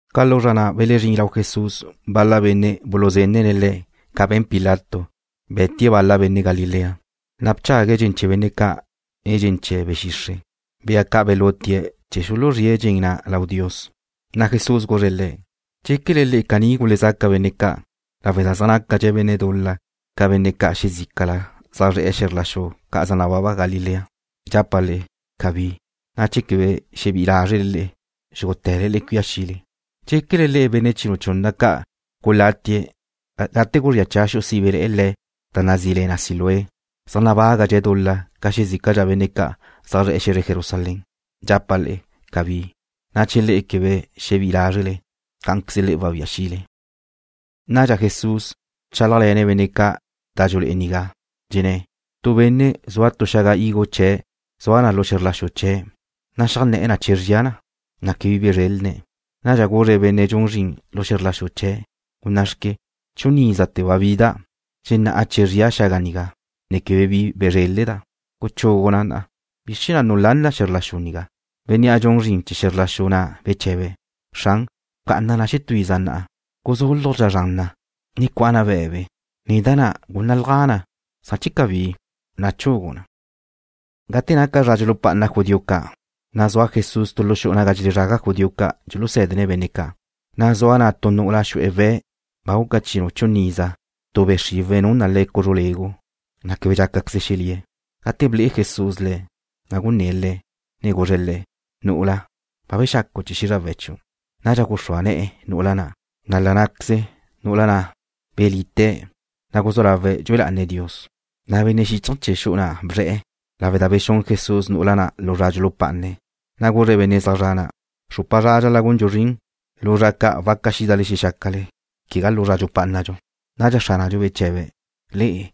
Ca lu zra na' belezrín bal-la benne' lau Jesús, na' buluzenne̱' Le̱' ca be̱n Pilato, be̱tie̱' bal-la benne' Galilea, na' bchague̱' dxen chee̱ benne' ca' nen dxen chee̱ be̱ xixre', bea ca' ba belutie̱' chee̱ xuluzríe̱' dxen chee̱ na lau Dios. Na' Jesús guzre̱' le̱': ―¿Dxéquele le'e caní gulezaca benne' ca' lawe' da zaj nácadxe̱' benne' dul-la ca benne' ca' xezícala zaj zre̱'e̱ xe̱zre ca' zaj nababa Galilea? Dxapa' le'e: Cabí, na' che quebe xebí'i lázrele le'e, xúgute̱le le'e cuía xile. ¿Dxéquele le'e benne' chinu chunna ca' gulatie̱' gate guzría cha xu'u sibe le̱' da nazí le na Siloé zaj nabágadxe̱' dul-la ca xezícala benne' ca' zaj zre̱'e̱ xe̱zre Jerusalén? Dxapa' le'e: Cabí, na' che le'e quebe xebí'i lázrele, cá'anqueze le'e wabía xile. Nadxa Jesús bchálajle̱ne̱' benne' ca' da dxulé'e nigá, dxenné̱': ―Tu benne' zua tu xaga higo chee̱' zua na lu xe̱zr la xu chee̱', na' xeajné̱'e̱ na che zría na, na' quebe bi bezrélene̱'. Nadxa guzre̱' benne' dxun zrin lu xe̱zr la xu chee̱': “Gunná'xque, chun ízate̱ ba bida' dxenná'a che zria xaga nigá, ne quebe bi bezréleda'. ¡Guchugu na! ¿Bizr chee̱ na' nulán na xe̱zr la xu nigá?” Bénnea' dxun zrin chee̱ xe̱zr la xu na' beche̱be̱': “Xran, bca'ana na xetú iza na'a. Guzúlujdxa' zran na, ne cua'a na be̱be. Nen da na', gúnnalja na, san che cabí, na' chugu' na.” Gate naca zra dxulupá'ana judío ca', na' zua Jesús tu lu xu'u naga dxelezraga judío ca' dxusé̱dene̱' benne' ca', na' zua na' tu nu'ula xu'e̱ we̱' ba guca chinu chunna iza. Tu be' xriwe̱' nun na le̱' cuzru legu, na' quebe dxácaqueze̱' xelíe̱'. Gate ble'e Jesús le̱', na' gunné̱' le̱', ne guzre̱' le̱': ―Nu'ula, ba bexacu' chee̱ xízrawe̱' chiu'. Nadxa guxrúa ne̱'e̱ nu'ula na', na' la ná'queze nu'ula na' belite̱', na' guzú lawe̱' dxue lá'ane̱' Dios. Na' benne' xíchaje̱ chee̱ xu'u na' bzre̱'e̱ lawe' da bexún Jesús nu'ula na' lu zra dxulupá'ane̱', na' guzre̱' benne' zaj zre̱'e̱ na': ―Xrupa zra dxal-la' gundxu zrin. Lu zra ca' waca xídale xexácale, quegá lu zra dxupá'anadxu. Nadxa Xránadxu beche̱be̱': ―Le'e,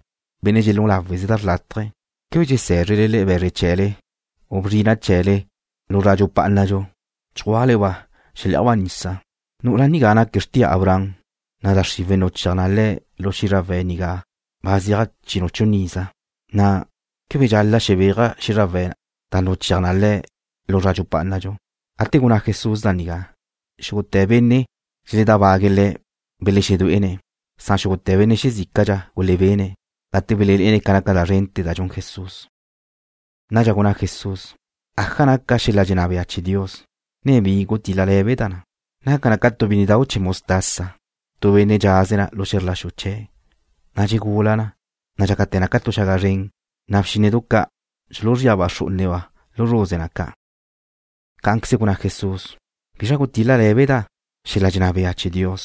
benne' dxelún láweze da xrlátaje, ¿quebe dxesé̱zrele le'e be̱zre chee̱le u burro chee̱le lu zra dxupá'anadxu chjua'le-ba' xelé'ajba' nisa? Nú'ula nigá naque̱' xrtia Abraham, na' da xriwe̱' nuchéaj na le̱' lu xízrawe̱' nigá ba zeaj chinu chunna iza, na' ¿quebe dxal-la' xebéaja' xízrawe̱' da nuchéaj na le̱' lu zra dxupá'anadxu? Gate gunná Jesús da nigá, xúgute̱ benne' dxeledábague̱' Le̱' belexedué'ene̱', na' xúgute̱ benne' xezícadxa gulebene̱' gate belelé'ene̱' ca naca da zrente̱ da dxun Jesús. Nadxa gunná Jesús: ―¿Aja naca xel-la dxenná bea chee̱ Dios, ne bi gutil-le lé̱beda' na? Naca na ca tu bínnedau' chee̱ mostaza, tu benne' dxaze̱' na lu xe̱zr la xu chee̱', na' dxegula na, ne dxácate̱ na ca tu xaga zren, na' bxínnedu ca' dxuluzríaba' xrú'uneba' lu zruze na ca'. Cá'anqueze gunná Jesús: ―¿Bizra gutil-le lé̱beda' xel-la dxenná bea chee̱ Dios?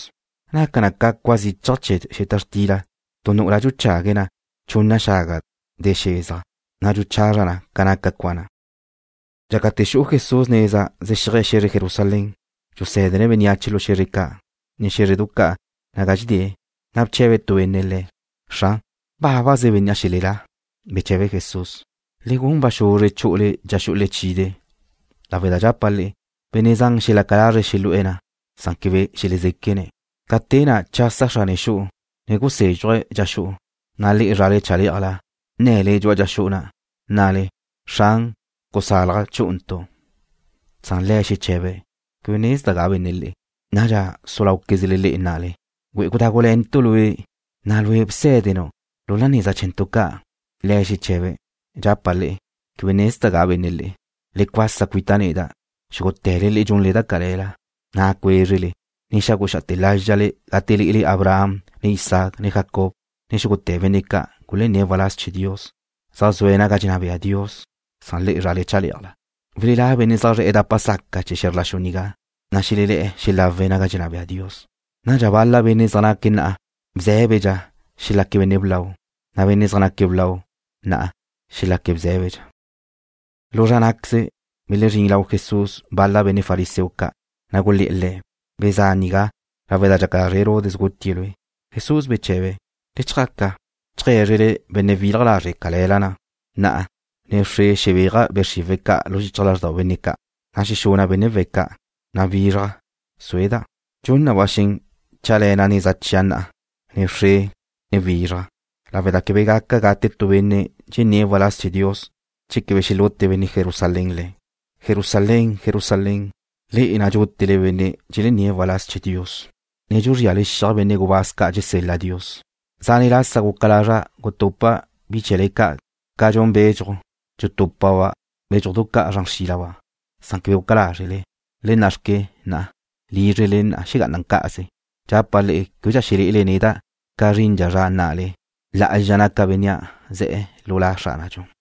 Naca na ca cua zichaj chee̱ xeta xtila tu nu'ula dxuchague̱' na chunna xaga de xezaj, na' dxuchazra na ca naca cua na'. Dxácate̱ xu'u Jesús neza zexíaje̱' xe̱zre Jerusalén, dxusé̱dene̱' bénneache lu xe̱zre ca', ne xé̱zredu ca' naga dxedée̱'. Na' bche̱be tu benne' Le̱': ―Xran, ¿bábaze benne' xelelá? Beche̱be Jesús: ―Le gun ba xuzre chu'ule dxa xu'u lechide', lawe' da dxapa' le'e, benne' zan xelaca lazre̱' xelu'e̱ na', na' quebe xelezéquene̱'. Ca te na' chasa xrane xu'u, ne gusézxuje̱' dxa xu'u, na' le'e zrale chalé'ajla nne̱le dxu'a dxa xu'u na', nnale: “Xran, gusalaj chú'untu'.” Na' le̱' xeche̱be̱': “Quebe nezda' ga benne' le'e.” Nadxa su láuquezle le'e nnale: “Güe'e gudágule̱ntu' lue', na' lue' bsé̱denu' lu neza chee̱ntu' ca'.” Le̱' xeche̱be̱': “Dxapa' le'e, quebe nezda' ga benne' le'e. Le cuasa cuita' neda', xúgute̱le le'e dxunle da cale̱la.” Na' cuézrele, ne xagu xá'ate̱ lázxale gate lé'ele Abraham, ne Isaac, ne Jacob, ne xúgute̱ benne' ca' gulenné̱' waláz chee̱ Dios, zaj zue̱' naga dxenná bea Dios, na' le'e zrale chalé'ajla. Welelá' benne' zaj zre̱'e̱ dapa saca chee̱ xe̱zr la xu nigá, na' xelebé'e̱ xelawe̱' naga dxenná bea Dios. Nadxa bal-la benne' zaj naque̱' bzé̱bedxa na'a xelaque̱' benne' blau, na' benne' zaj naque̱' blau na'a xelaque̱' bzé̱bedxa. Lu zra ná'queze, belezrín lau Jesús bal-la benne' fariseo ca', na' gulé̱'e̱ Le̱': ―Bezá' nigá, lawe' da dxaca lazre' Herodes gutie̱' Lue'. Jesús beche̱be̱': ―Le chjaca cheajgué̱zrele benne' wilaj lazre' cale̱la na': “Na'a, ne wxre xebéaja' be' xriwe̱' ca' lu xichaj lázrdau benne' ca', ne xexuna' benne' we̱' ca', na' wizraj sueda'.” Dxun na ba xen chéajle̱na' neza chia' na'a, ne wxre, ne wizraj, lawe' da quebe gaca gate tu benne' dxenné̱' waláz chee̱ Dios che quebe xelute benne' Jerusalén le̱'. “Jerusalén, Jerusalén, le'e na' dxútele benne' dxelenné̱' waláz chee̱ Dios, ne dxuzríale xiaj benne' gubáz ca' dxesel-la Dios. Zane' lasa guca lazra' gutupa' bi chee̱le ca' ca dxun bedxuj, dxutúpaba' bédxujdu ca' zran xrílaba', san quebe guca lázrele. ¡Le nna'xque, na'a! Lízrele le'e xegá'ana na cá'aze. Dxapa' le'e québedxa xelé'ele neda' ca zrindxa zra nnale: ¡Lá'azxa naca Bénnea' ze̱'e̱ lu La Xránadxu!”